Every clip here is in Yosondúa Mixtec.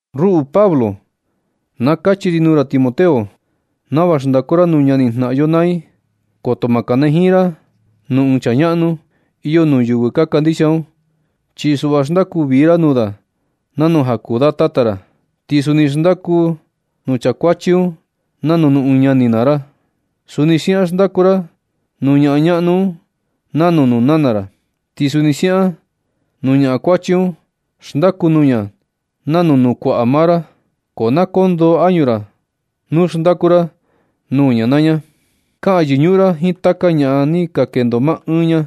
Ruꞌu Pablo, na kachi ri nuu ra Timoteo, nava xndaku ra nuu ñani jnaꞌan yo naa i. Koto ma kanajiin ra nuu ɨɨn chaa ñaꞌnu iyo nuu yɨvɨ ka kandixia un, chi suꞌva xndaku vii ra nuu da nanu ja kuu da tata ra. Ti suni xndaku nuu chaa kuachi un nanu nuu ɨɨn ñani maa ra. Suni siaꞌan xndaku ra nuu ñaꞌan ñaꞌnu un nanu nuu nana ra, ti suni siaꞌan nuu ñaꞌan kuachi un. Xndaku nuu ña nanu nuu kuaꞌa maa ra, ko na koo ndoo añu ra hora xndaku ra nuu ña naa ña. Kaꞌan yɨñuꞌun ra jiin taka ñaꞌan ni ka kendo maa ɨɨn ña.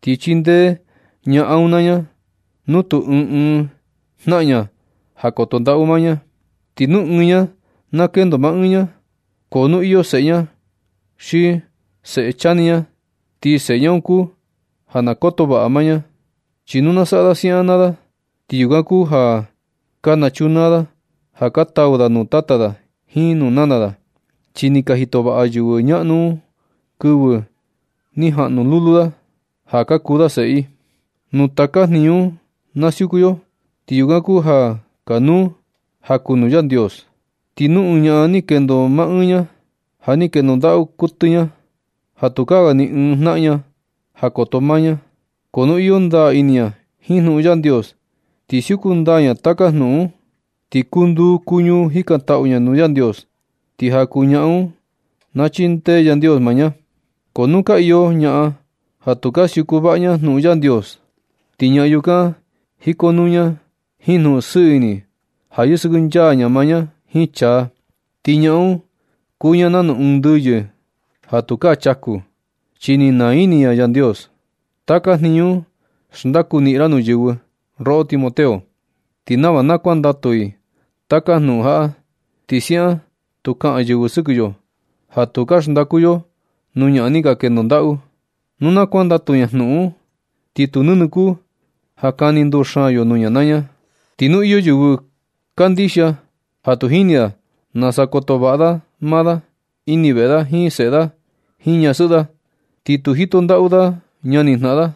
Ti chindee ñaꞌan un naa ña nu tu ɨɨn ɨɨn jnaꞌan ña ja koto ndaꞌu maa ña. Ti nu ɨɨn ña na kendo maa ɨɨn ña, ko nu iyo seꞌe ña xi seꞌe chani ña, ti seꞌe ña un kuu ja na koto vaꞌa maa ña. Chi nu na saꞌa da siaꞌan naa da, ti yukan kuu ja ka nachunaa da ja ka tau da nuu tata da jiin nuu nana da, chi ni ka jito vaꞌa yɨvɨ ñaꞌnu un kɨvɨ ni jaꞌnu lulu da ja ka kuu da seꞌe i. Nu taka jniñu un na siuku yo, ti yukan kuu ja kanuu ja kuu nuu Yandios. Ti nu ɨɨn ñaꞌan ni kendo maa ɨɨn ña, ja ni kendo ndaꞌu kuɨtɨ ña, ja tukaa ga ni ɨɨn jnaꞌan ña ja koto maa ña. Ko nu iyo ndaa ini ña jiin jnuꞌun Yandios, ti siuku ndaa ña taka jnuꞌun un, ti kuu nduu kuu ñuu jikantaꞌu ña nuu Yandios. Ti ja kuu ñaꞌan un na chindee Yandios maa ña. Ko nu ka iyo ñaꞌan ja tu ka siuku vaꞌa ña jnuꞌun Yandios, ti ñaa yukan jikonuu ña jiin jnuꞌun sɨɨ ini ja yɨsɨkɨnchaa ña maa ña jiin chaa. Ti ñaꞌan un kuu ña nanu ɨɨn ndɨyɨ ja tukaa chaku, chi ni naa ini ña Yandios. Taka jniñu un xndaku niꞌin ra nuu yɨvɨ, roꞌo Timoteo, ti nava na kuandatu i taka jnuꞌun jaꞌa. Ti siaꞌan tu kaꞌan yɨvɨ sɨkɨ yo ja tu ka xndaku yo nuu ñaꞌan ni ka kendo ndaꞌu. Nu na kuandatu ña jnuꞌun un, ti tu nɨnɨ kuu ja kani nduxaan yo nuu ña naa ña. Ti nu iyo yɨvɨ kandixia ja tu jini da nasa koto vaꞌa da maa da ini veꞌe da jiin seꞌe da jiin ñasɨꞌɨ da, ni tu jito ndaꞌu da ñani jnaꞌan da,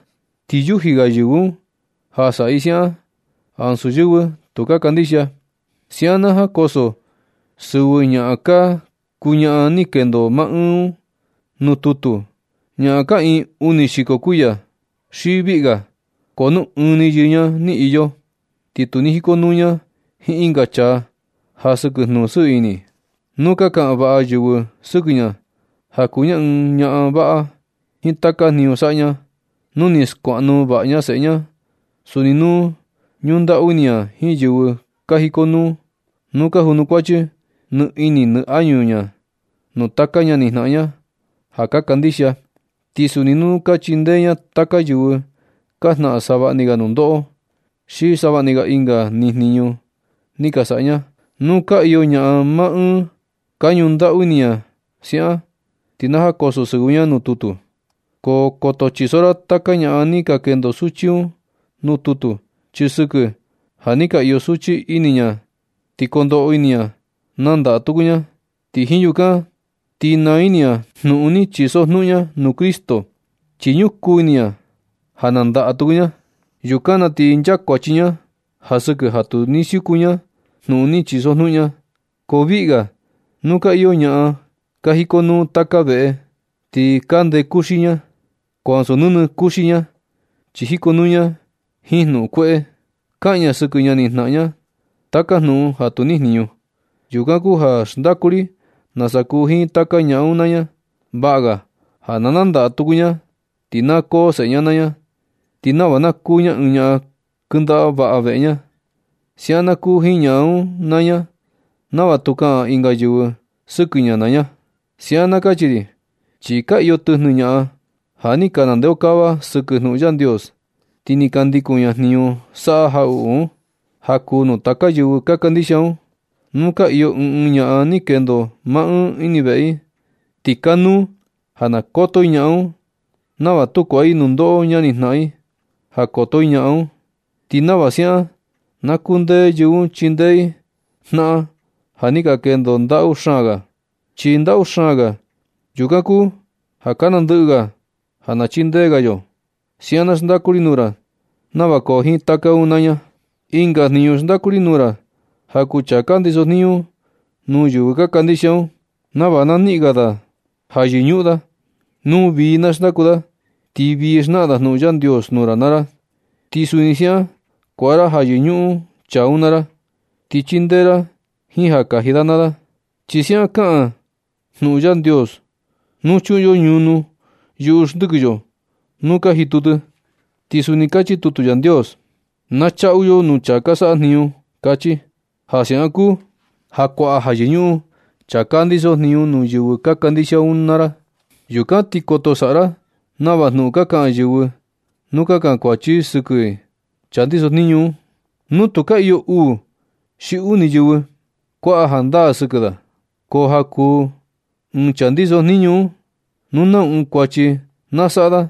ti yuji ga yɨvɨ un ja saꞌa i siaꞌan ansu yɨvɨ tu ka kandixia. Siaꞌan na jankoso sɨvɨ ñaꞌan ka kuu ñaꞌan ni kendo maa ɨɨn un nuu tutu, ñaꞌan kaꞌiin uni xiko kuiya xi viꞌga. Ko nu ɨɨn ni yɨɨ ña ni iyo, ti tu ni jikonuu ña jiin ɨnga chaa ja sɨkɨ jnuꞌun sɨɨ ini un. Nu ka kaꞌan vaꞌa yɨvɨ sɨkɨ ña ja kuu ña ɨɨn ñaꞌan vaꞌa jiin taka jniñu saꞌa ña, nu ni skuaꞌnu vaꞌa ña seꞌe ña, suni nu ñundaꞌu ini ña jiin yɨvɨ ka jikonuu, nu ka junukuachi nɨ ini nɨ añu ña nuu taka ñani jnaꞌan ña ja ka kandixia, ti suni nu ka chindee ña taka yɨvɨ ka jnaꞌan savaꞌni ga nundoꞌo, xi savaꞌni ga na ɨnga ni jniñu ni ka saꞌa ña, nu ka iyo ñaꞌan maa ɨɨn ka ñundaꞌu ini ña siaꞌan, ti na jankoso sɨvɨ ña nuu tutu. Ko koto chiso ra taka ñaꞌan ni ka kendo suchi un nuu tutu, chi sɨkɨ ja nɨ ka iyo suchi ini ña ti kondoꞌo ini ña nandaꞌa tuku ña, ti jiin yukan ti naa ini ña jnuꞌun ni chisojnuꞌun ña nuu Cristo, chi ñukuu ini ña ja nandaꞌa tuku ña. Yukan na ti nchakuachi ña ja sɨkɨ ja tu ni siuku ña jnuꞌun ni chisojnuꞌun ña. Ko viꞌi ga nu ka iyo ñaꞌan ka jikonuu taka veꞌe, ti ka ndee kuxi ña. Ko ansu nɨnɨ kuxi ña, chi jikonuu ña jiin jnuꞌun kueꞌe. Kaꞌan ña sɨkɨ ñani jnaꞌan ña taka jnuꞌun ja tu nijniñu. Yukan kuu ja na xndaku ri nasa kuu jiin taka ñaꞌan un naa ña. Vaꞌa ga ja na nandaꞌa tuku ña ti na koo seꞌe ña naa ña, ti nava na kuu ña ɨɨn ñaꞌan kɨndaꞌa vaꞌa veꞌe ña. Siaꞌan na kuu jiin ñaꞌan un naa ña nava tu kaꞌan ɨnga yɨvɨ sɨkɨ ña naa ña. Siaꞌan na kachi ri, chi ka iyo tɨjnɨ ñaꞌan ja ni ka nandeokava sɨkɨ jnuꞌun Yandios, ti ka ndikun ña jniñu saꞌa jaꞌuꞌu un. Ja kuu nuu taka yɨvɨ ka kandixia un, nu ka iyo ɨɨn ɨɨn ñaꞌan ni kendo maa ɨɨn ini veꞌe i, ti kanuu ja na koto i ñaꞌan un, nava tu kuaꞌa i nundoꞌo ñani jnaꞌan i ja koto i ñaꞌan un. Ti nava siaꞌan na kundee yɨvɨ un chindee i naꞌan ja ni ka kendo ndaꞌu xaan ga. Chi ndaꞌu xaan ga, yukan kuu ja ka nandɨꞌɨ ga ja na chindee ga yo. Siaꞌan na xndaku ri nuu ra nava koo jiin taka un naa ña. Ɨnga jniñu xndaku ri nuu ra ja kuu chaa ka ndiso jniñu nuu yɨvɨ ka kandixia un, nava na niꞌin ga da ja yɨñuꞌun da, nu vii na xndaku da. Ti vii xnaꞌan da jnuꞌun Yandios nuu ra naa ra, ti suni siaꞌan kuaꞌa ra ja yɨñuꞌun da chaa un naa ra. Ti chindee ra jiin ja kaji da naa da. Chi siaꞌan kaꞌan jnuꞌun Yandios: “Tu chuꞌun yo ñunu yuꞌu xndɨkɨ yo nu kaa jitu tɨ.” Ti suni kachi tutu Yandios: “Na chaꞌu yo nuu chaa saꞌa jniñu”, kachi. Ja siaꞌan kuu ja kuaꞌa ja yɨñuꞌun chaa ka ndiso jniñu nuu yɨvɨ ka kandixia un naa ra. Yukan ti koto saꞌa ra nava jnuꞌun ka kaꞌan yɨvɨ nu ka kankuachi i sɨkɨ ɨɨn chaa ndiso jniñu un, nu tu ka iyo uu xi uni yɨvɨ kuaꞌa jandaa sɨkɨ da. Ko ja kuu ɨɨn chaa ndiso jniñu un, nu nau ɨɨn kuachi na saꞌa da,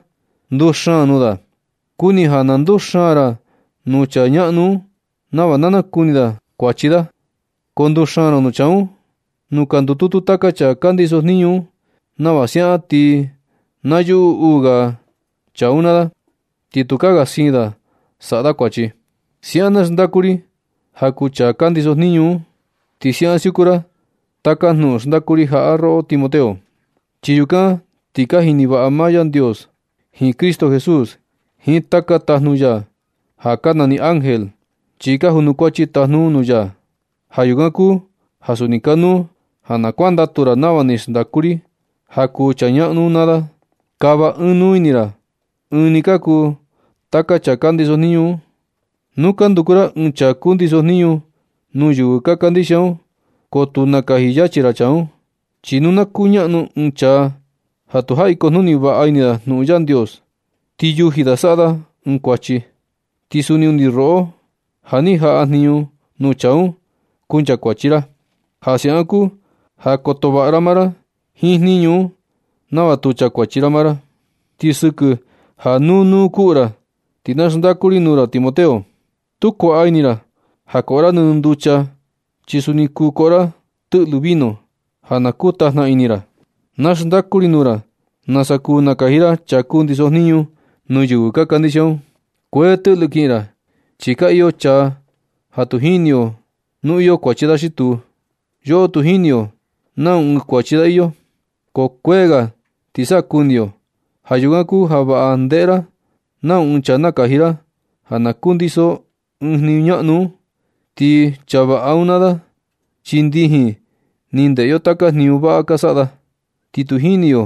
nduxaan nuu da. Kuni ja na nduxaan ra nuu chaa ñaꞌnu un, nava na nakuni da kuachi da. Ko nduxaan ra nuu chaa un nuu ka ndututu taka chaa ka ndiso jniñu un nava siaꞌan ti na yuꞌu uu ga chaa un naa da, ti tukaa ga siin da saꞌa da kuachi. Siaꞌan na xndaku ri ja kuu chaa ka ndiso jniñu un, ti siaꞌan siuku ra taka jnuꞌun xndaku ri jaꞌa, roꞌo Timoteo. Chi yukan ti ja jini vaꞌa maa Yandios jiin Cristo Jesús jiin taka tajnu ya ja ka nani ángel, chi ka junukuachi tajnu un nuu ya. Ja yukan kuu ja suni kanuu ja na kuandatu ra nava ni xndaku ri ja kuu chaa ñaꞌnu un naa da. Kava ɨɨn nuu ini ra chi ɨɨn ni ka kuu taka chaa ka ndiso jniñu un. Nu na nduku ra ɨɨn chaa kundiso jniñu nuu yɨvɨ ka kandixia un, ko tu nakaji yachi ra chaa un. Chi nu na kuñaꞌnu ɨɨn chaa ja tu jaꞌi kujnuni vaꞌa ini da jnuꞌun Yandios, ti yuji da saꞌa da ɨɨn kuachi. Ti suni undi roꞌo ja ni jaꞌa jniñu nuu chaa un, kunchakuachi ra. Ja siaꞌan kuu ja koto vaꞌa maa ra jiin jniñu un nava tu chakuachi ra maa ra. Ti sɨkɨ ja nuu nuu kuꞌu ra, ti na xndaku ri nuu ra Timoteo. Tu kuaꞌa ini ra ja koꞌo ra nɨnɨ nducha ni, chi suni kuu koꞌo ra tɨꞌlɨ vino ja na kuu tajna ini ra. Na xndaku ri nuu ra nasa kuu nakaji ra chaa kundiso jniñu nuu yɨvɨ ka kandixia un. Kuee tɨꞌlɨ kiꞌin ra, chi ka iyo chaa ja tu jini yo nu iyo kuachi da xi tuu. Yoꞌo tu jini yo nau ɨɨn kuachi da iyo, ko kuee ga ti sa kuni yo. Ja yukan kuu ja vaꞌa ndeꞌe ra nau ɨɨn chaa nakaji ra ja na kundiso ɨɨn jniñu ñaꞌnu un. Ti chaa vaꞌa un naa da, chi ndijin ni ndeꞌe yo taka jniñu vaꞌa ka saꞌa da. Ti tu jini yo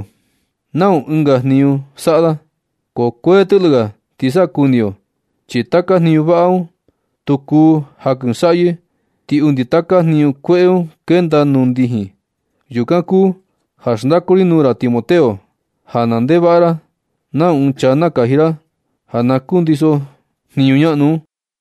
nau ɨnga jniñu saꞌa da, ko kuee tɨꞌlɨ ga ti sa kuni yo. Chi taka jniñu vaꞌa un tu kuu jankɨsaꞌyɨ, ti undi taka jniñu kueꞌe un kenda nuu ndijin. Yukan kuu ja xndaku ri nuu ra Timoteo, ja na ndeꞌe vaꞌa ra nau ɨɨn chaa nakaji ra ja na kundiso jniñu ñaꞌnu un.